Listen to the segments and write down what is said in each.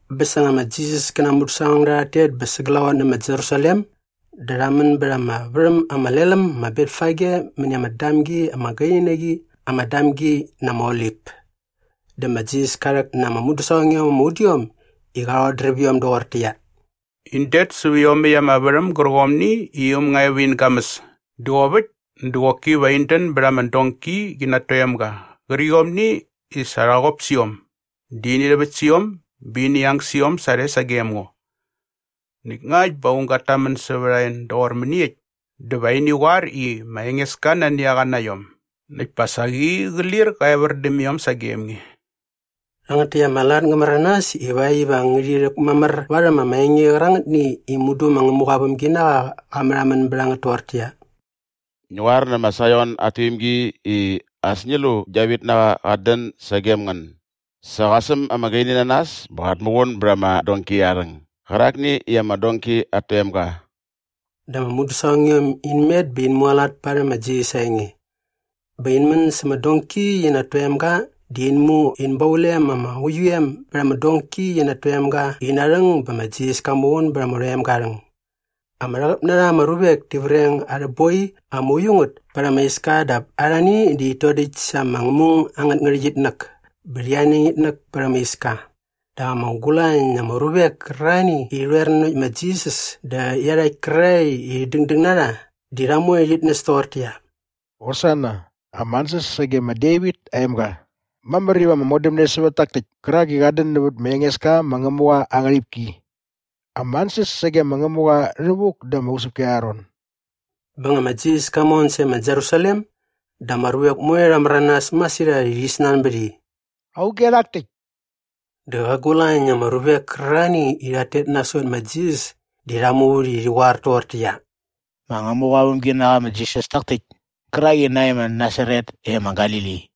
Bä sa nga ma Jisas kä na aa mudäsaqongda rhat tet bä sa glaqot nä ma Jerusalem dä rha män bät ama värhäm ama lel äm ma Betfage mäni ama damgi ama gaini na qi ama Damgi na ama Olip. Dä ma Jisas ka rhäk na ama mudäsaqongiom ama udiom i qa rhodräp iom doqortäqyia, “In det säp iomäkt ama värhäm gärqomni i äm nga e va in gamäs dä qop äkt dä qoki va in dän bät ama donki qi na at toemga qärqiomni i sa rha qop sä iom dä ini rhäväkt sä iom bä ini ang sä iom sarhe sagem ngo. Näkt ngakt bä aung gat tamän sävät a en doqor mäniekt dä va ini qoar i ma Engeska nani a qa na iom näkt pa saqi qä lir qä evär däm iom sagem nge.” Rhangät täkt ama lat ngä märanas ivakt iva ngärhi rhäkmamär varhäm ama enge qärangätni i mudu ma Ngämuqa aa vämginaqa qa märhamän bät a ngät toqortäqyia, “Ngi qoar nä ma Saion at tuimgi i, ‘As ngi lu i gia vitnaqa qat dän sagem ngän! Sa qa säm ama gaini na nas bä qat muqun bät ama donki aa rhäng gärakni i ama donki at toemga.’” Dä ama mudäsaqongiom in met bä in mualat parhäm ma Jisas aa enge. Bä in män sa ama donki qi na at toemga dä in mu in baulem ama uiu em bät ama donki qi na at toemga ina rhäng bä ma Jisas ka muqun bät ama rhoemga aa rhäng. Ama rhäqäp na rha ama ruvek ti vreng arhä boi ama uiu ngät pät ama iska dap arhani di rhit dodäkt sa ama ngämung angät ngärhäqyitnäk bä rhi aneng itnäk pät ama iska. Dä ama gulañ na ama ruvek kärarhani i rhi rhoer nanokt ma Jisas dä iarhakt kärarhae i dängdäng na rha di rha moe rhit näs toqortäqyia, “Hosana, ama ansäs sage ma Devit aa emga. Mamär iva ama modämne sävät tak täkt kärak i qat dän nävät ma Engeska ma Ngämuqa aa ngärhipki. Ama ansäs sage ma Ngämuqa rhävuk da ama usäpki arha ron!” Bä nga ma Jisas ka mon sae ma Jerusalem dä ama ruvek moe rha märanas masirhat i rhi snanbät i, “Auge rhak täkt?” Dä qa gulañ na ama ruvek kärarhani i rhat tet nasot ma Jisas di rha muvät i rhi qoar toqortäqyia, “Ma Ngämuqa aa vämginaqa ma Jisas tak täkt kärak i nae ma Nasaret e ma Galili.”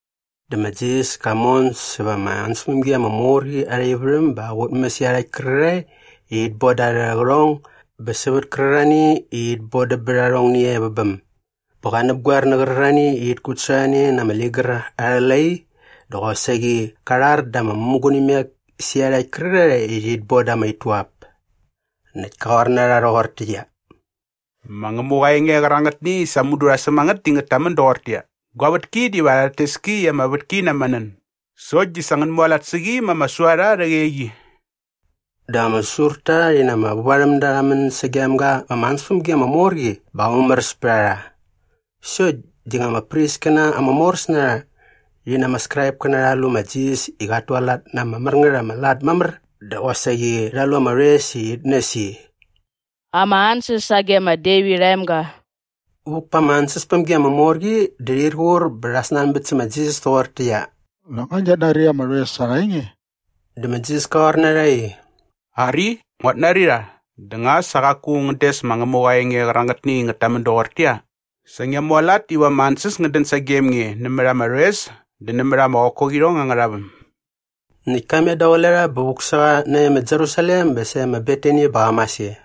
Dä ma Jisas ka mon säva ama ansäspämgi ama mor qi arha ivärhäm bä qa qutmäs iarhakt kärarhae i rhit boda arhä qärhong bä sävät kärarhani i rhit bodäm bät arhongni e vä bäm. Bä qa näpgoer nä qärarhani i rhit kutsasorhane na ama ligär arhä lai dä qosaqi qa rhar da ama mämugunimek sä iarhakt kärarhae i rhit boda ama ituap. Näkt ka qoar na rha rhoqortäqyia, “Ma Ngämuqa aa enge qärangätni i sa mudu rha säm a ngät di ngät tamän doqortäqyia, ‘Gua vätki diva rhat tes ki i ama vätki na ama nän’ sokt di sa ngän mualat sä qi ma ama suarha arhä qeqi.” Dä ama säsurta rhi na ama vävarhämda rha män sagem ga va ama ansäspämgi ama mor qi bä qa mumäräs pät a rha. Sokt di nga ama priskäna ama moräs na rha rhi na ama Skraipkäna rha lu ma Jisas i qat tualat na ama mär ngät ama lat mamär dä qosaqi rha lu ama rhoes i rhit näs i, “Ama ansäs sage ma Devit aa emga” vuk pa ama ansäspämgi ama mor qi dä rhir qur bä rha snanbät sä ma Jisas toqortäqyia, “Nak nga ngiat nari ama rhoes arha enge?” Dä ma Jisas ka qoar na rha i, “Ari, nguat nari rha dä nga sa qaku ngän des ma Ngämuqa aa enge qärangätni i ngät tamän doqortäqyia, “‘Sa ngia mualat iva ama ansäs ngät dän sagem nge nämät ama rhoes dä nämät ama qokoqirhong angärha väm’?” Näkt ka met daqule rha bä vuk sä qa nae ma Jerusalem bä sae ma Betani bä qa mas e.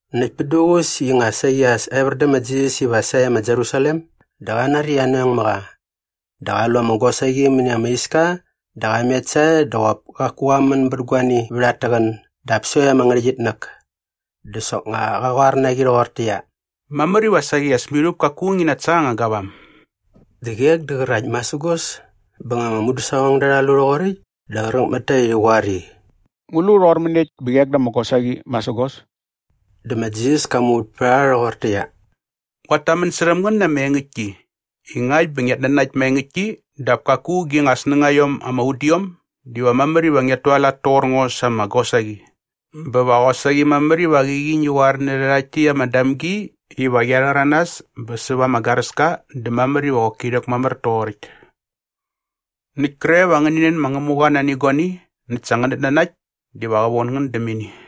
Näkt pät duququs i nga saqi as evär dä ma Jisas iva sae ma Jerusalem dä qa nari i anoeng mä qa. Dä qa lu ama gosaqi mäni ama iska dä qa met sae dä qop kaku qa män bät guani vät at täqän dap sokt ama ngärhäqyitnäk. Dä soknga qa qoar na qi rhoqortäqyia, “Mamär iva saqi as mirhup kaku ngi natsa anga gavam.” Dä qek dä qärakt masägos. Bä nga ama mudäsaqongda rha lu rhoqoräkt dä qräk mät ta i rhi qoar i, “Ngu lu rhoqor mäniekt bä qek da ama gosaqi masägos?” Dä ma Jisas ka muvät pät a rha rhoqortäqyia, “Nguat tamän särhäm ngän na ama engäktki i ngakt bä ngiat nanakt maengäktki dap kaku gi nga snängaiom ama udiom diva mamär iva ngiat tualat toqor ngo sa ama gosaqi bä va qosaqi mamär iva qäqi ngi qoar nä rhärhakt täkt ama damgi iva qia rhäranas bä säva ama garäska dä mamär iva qoki rhäkmamär toqoräkt.” Näkt kre va ngäni nän ma Ngämuqa nani guani näkt sa ngänät nanakt diva qä von ngän däm ini.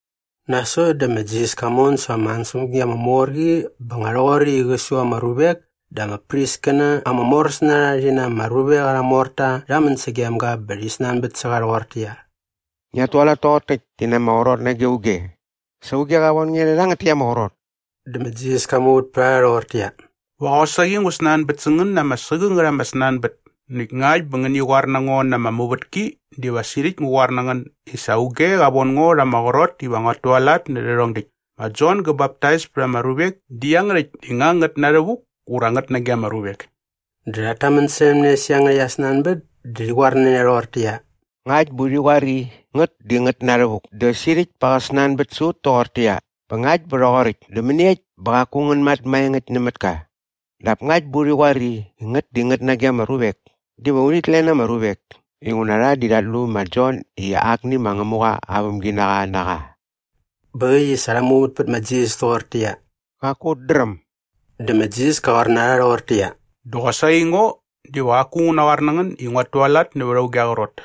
Nasot dä ma Jisas ka mon säva ama ansäspämgi ama mor qi bä nga rhoqoräkt i qä su ama ruvek dä ama priskäna ama moräs na rha rhi na ama ruvek arha morta rha män sagem ga bä rhi snanbät sä qa rhoqortäqyia, “Ngiat tualat toqor täkt di na ama qrot nage auge? Sa auge qa von nge rhä rhangät täkt ama qrot?” Dä ma Jisas ka muvät pät a rha rhoqortäqyia, “Va qosaqi ngu snanbät sä ngän na ama sägängät ama snanbät näkt ngakt bä ngäni qoar na ngo na ama muvätki diva sirhäkt ngu qoar na ngän i sa auge qa von ngo rha ama qrot iva nguat tualat nä rhärhong däkt. Ma Jon gä baptais pät ama ruvek di iangärhäkt di nga ngät na rhävuk ura ngät nage ama ruvek?” Dä rhat tamän särhäm ne sä iangärhäkt aa snanbät dä rhi qoar na ne rhoqortäqyia, “Ngakt bä urhi qoar i, ‘ngät di ngät na rhävuk’ dä sirhäkt pa qä snanbät sä ut toqortäqyia, ‘Bä ngakt bä rhoqoräkt dä mäniekt bä qaku ngän mat maengäkt nämät ka?’ Dap ngakt bä urhi qoar i ‘ngät di ngät nage ama ruvek’ diva urhit len ama ruvek inguna rha di rhat lu ma Jon i akni ma Ngämuqa aa vämginaqa na qa.” Bä äkt i sa rha muvät pät ma Jisas toqortäqyia, “Qaku ut dräm.” Dä ma Jisas ka qoar na rha rhoqortäqyia, “Dä qosaqi ngo diva qaku ngu naqoar na ngän i nguat tualat nävät auge aa qrot.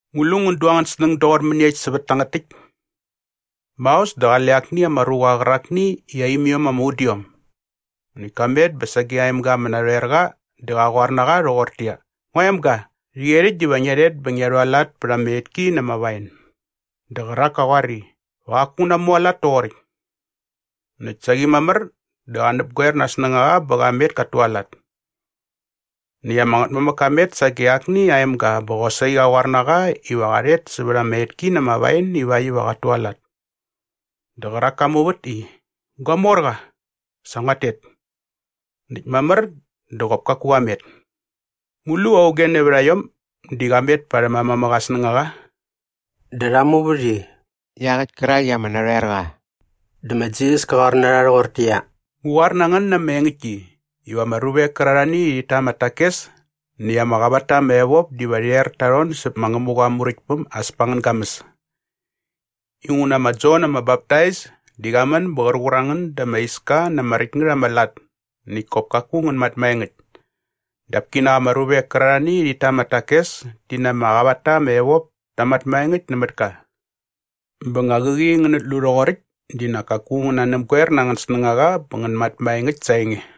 “Ngu lu ngän du angän snäng doqor mäniekt sävät tangät täkt? Maos dä qale akni ama ruqa qärakni i aa imiom ama udiom. Näkt ka met bä sage aa emga ama narhoer qa dä qa qoar na qa rhoqortäqyia, ‘Ngua emga, rhäqyerhäkt diva ngia rhet bä ngia rhualat pät ama etki na ama wain.’ Dä qärak ka qoar i, ‘Va qaku ngu namualat toqoräkt.’ Näkt saqi mamär dä qa näpgoer na aa snängaqa bä qa met kat tualat. Näkt ama ngätmamäk ka met sage akni aa emga bä qosaqi qa qoar na qa iva qa rhet sävät ama etki na ama wain ivakt iva qat tualat. Dä qärak ka muvät i, ‘Gua morqa, sa nguat tet.’ Näkt mamär dä qop kaku qa met. Ngu lu auge nävät a iom di qa met parhäm aa mamäk aa snängaqa?” Dä rha muvät i, “Iaqäkt kärak i ama narhoer qa.” Dä ma Jisas ka qoar na rha rhoqortäqyia, “Ngu qoar na ngän na ama engäktki iva ama ruvek kärarhani i rhit ta ama takes näkt ama qavat ta ama evop diva rhi er ta rhon säp ma Ngämuqa aa Muräktpäm as pa angän gamäs. Inguna ma Jon ama Baptais di qa män bä qär qur a ngän da ama iska na ama räkt ngät ama lat näkt kop kaku ngän mat maengäkt. Dap kinak ama ruvek kärarhani i rhit ta ama takes ti na ama qavat ta ama evop ta mat maengäkt nämät ka. Bä nga qäqi ngänät lu rhoqoräkt di nak kaku ngän nanäpgoer na angän snängaqa bä ngän mat maengäkt sa aa enge.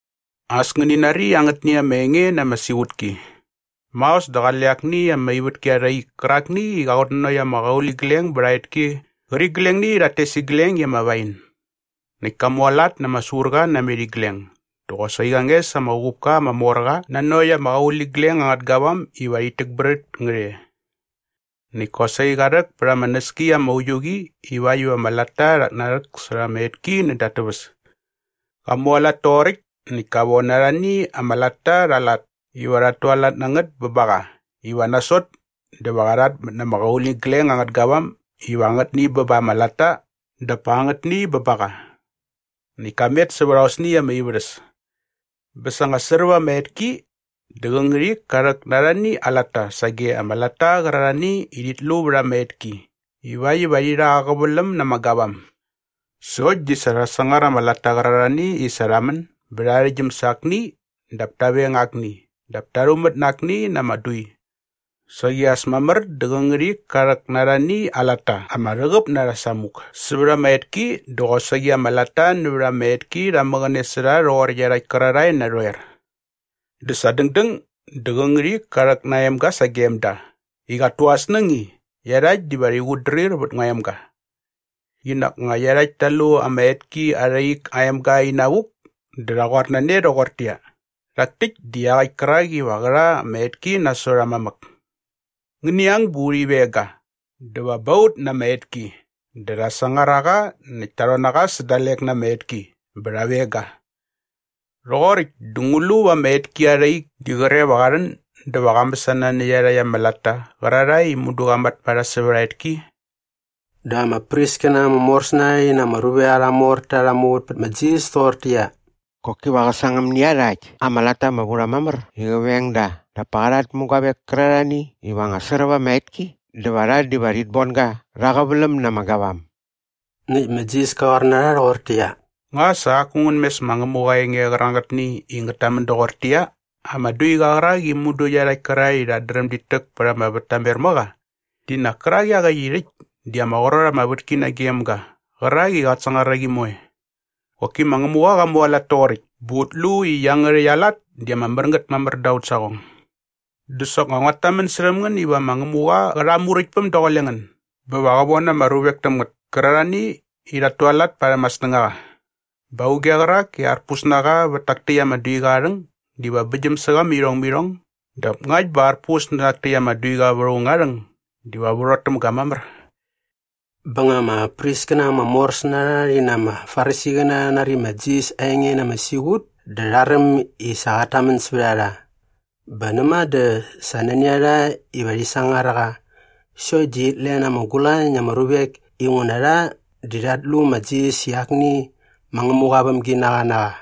“As ngäni nari angätni ama enge na ama siqutki. Maos dä qale akni ama ivätki arha ik kärakni i qa qutnanokt ama qauligleng bät aa etki qärqiglengni i rhat tes igleng i ama wain. Näkt ka mualat na ama surqa namet igleng dä qosaqi qa nges ama uqupka ama mor qa nanokt ama qauligleng angät gavam iva rhit täkbrät ngät e. Näkt kosaqi qa rhäk pät ama näski ama uiu qi ivakt iva ama latta rhat narhäksärha ama etki näda at täväs. Qa mualat toqoräkt näkt ka von arhani ama latta rha aa lat iva rhat tualat na ngät bä ba qa iva nasot dä va rha rhatmät na ama qauligleng angät gavam iva angätni bä ba ama latta dap pa angätni bä ba qa. Näkt ka met sävät aosni ama ivärhäs. “Bä sa nga sräp ama etki dä qä ngärhik ka rhäk na arhani aa latta sage ama latta qärarhani i rhit lu vät ama etki ivakt iva rhi rha aa qäväläm na ama gavam. Sokt di sa rha sangar ama latta qärarhani i sa rha män bä rha arhäktgyäm sa akni dap ta veng akni dap ta rhumät na akni na ama dui. Saqi as mamär dä qä ngärhik ka rhäk na arhani aa latta ama rhäqäp na rha samuk sävät ama etki dä qosaqi ama latta nävät ama etki rha mäqäne sä rha rhoqor iarhakt kärarhae narhoer. “Dä sa dängdäng dä qä ngärhik ka rhäk na aa emga sagem da i qat tu aa snäng i, ‘Iarhakt diva rhi qutdrir vät ngua emga.’ Qinak nga iarhakt ta lu ama etki arha ik aa emga inavuk dä rha qoar na ne rhoqortäqyia, ‘Rhak täkt di iaqäkt kärak iva qä rha ama etki nasot aa mamäk. Ngäni ang bä urhi veng ga dä va ba ut na ama etki.’ Dä rha sangar a qa näkt ta rhon na qa sä dalek na ama etki bä rha veng ga. “Rhoqoräkt dä ngu lu va ama etki arha ik di qre va qa rhän dä va qa mäsana nä iarhakt ama latta qärarhae i mudu qa mat ma rha sävät aa etki?” Dä ama priskäna ama moräs na rha rhi na ama ruvek arha morta rha muvät pät ma Jisas toqortäqyia, “Qoki va qä sangäm nä iarhakt ama latta ama vu rha mamär i qä veng da dap pa qa rhat mä guavek kärarhani iva nga sräp ama etki dä va rha diva rhit bon ga rha aa qäväläm na ama gavam.” Näkt ma Jisas ka qoar na rha rhoqortäqyia, “Nga sa qaku ngän mes ma Ngämuqa aa enge qärangätni i ngät tamän doqortäqyia, “‘Ama duiqa qärak i mudu iarhakt kärarhae i rhat dräm dit täk pät ama vät ta mer mä qa di nak kärak iaqäkt i rhäkt di ama qrot ama vätki nagem ga qärak i qat sangar a qi moe. Qoki ma Ngämuqa qa mualat toqoräkt bä ut lu i iangärhäkt aa lat di ama mär ngät mamär da aut saqong’? Dä soknga nguat tamän särhäm ngän iva ma Ngämuqa qä rha aa Muräktpäm daqule ngän bä va qä von ama ruvek täm ngät kärarhani i rhat tualat parhäm aa snängaqa. Bä auge qärak i arpus na qa vät tak täkt ama duiqa aa rhäng diva bäktgyäm sä qa mä irhong mä irhong dap ngakt bä arpus nä rhak täkt ama duiqa vät aung aa rhäng diva värhot täm ga mamär.” Bä nga ama priskäna ama moräs na rha rhi na ama Farisiqäna rha nari ma Jisas aa enge na ama siqut dä rha räm i sa qat tamän sävät a rha. Bä näma dä sa nani a rha iva rhi sangar a qa sokt di rhit len ama gulañ na ama ruvek inguna rha di rhat lu ma Jisas i akni ma Ngämuqa aa vämginaqa na qa.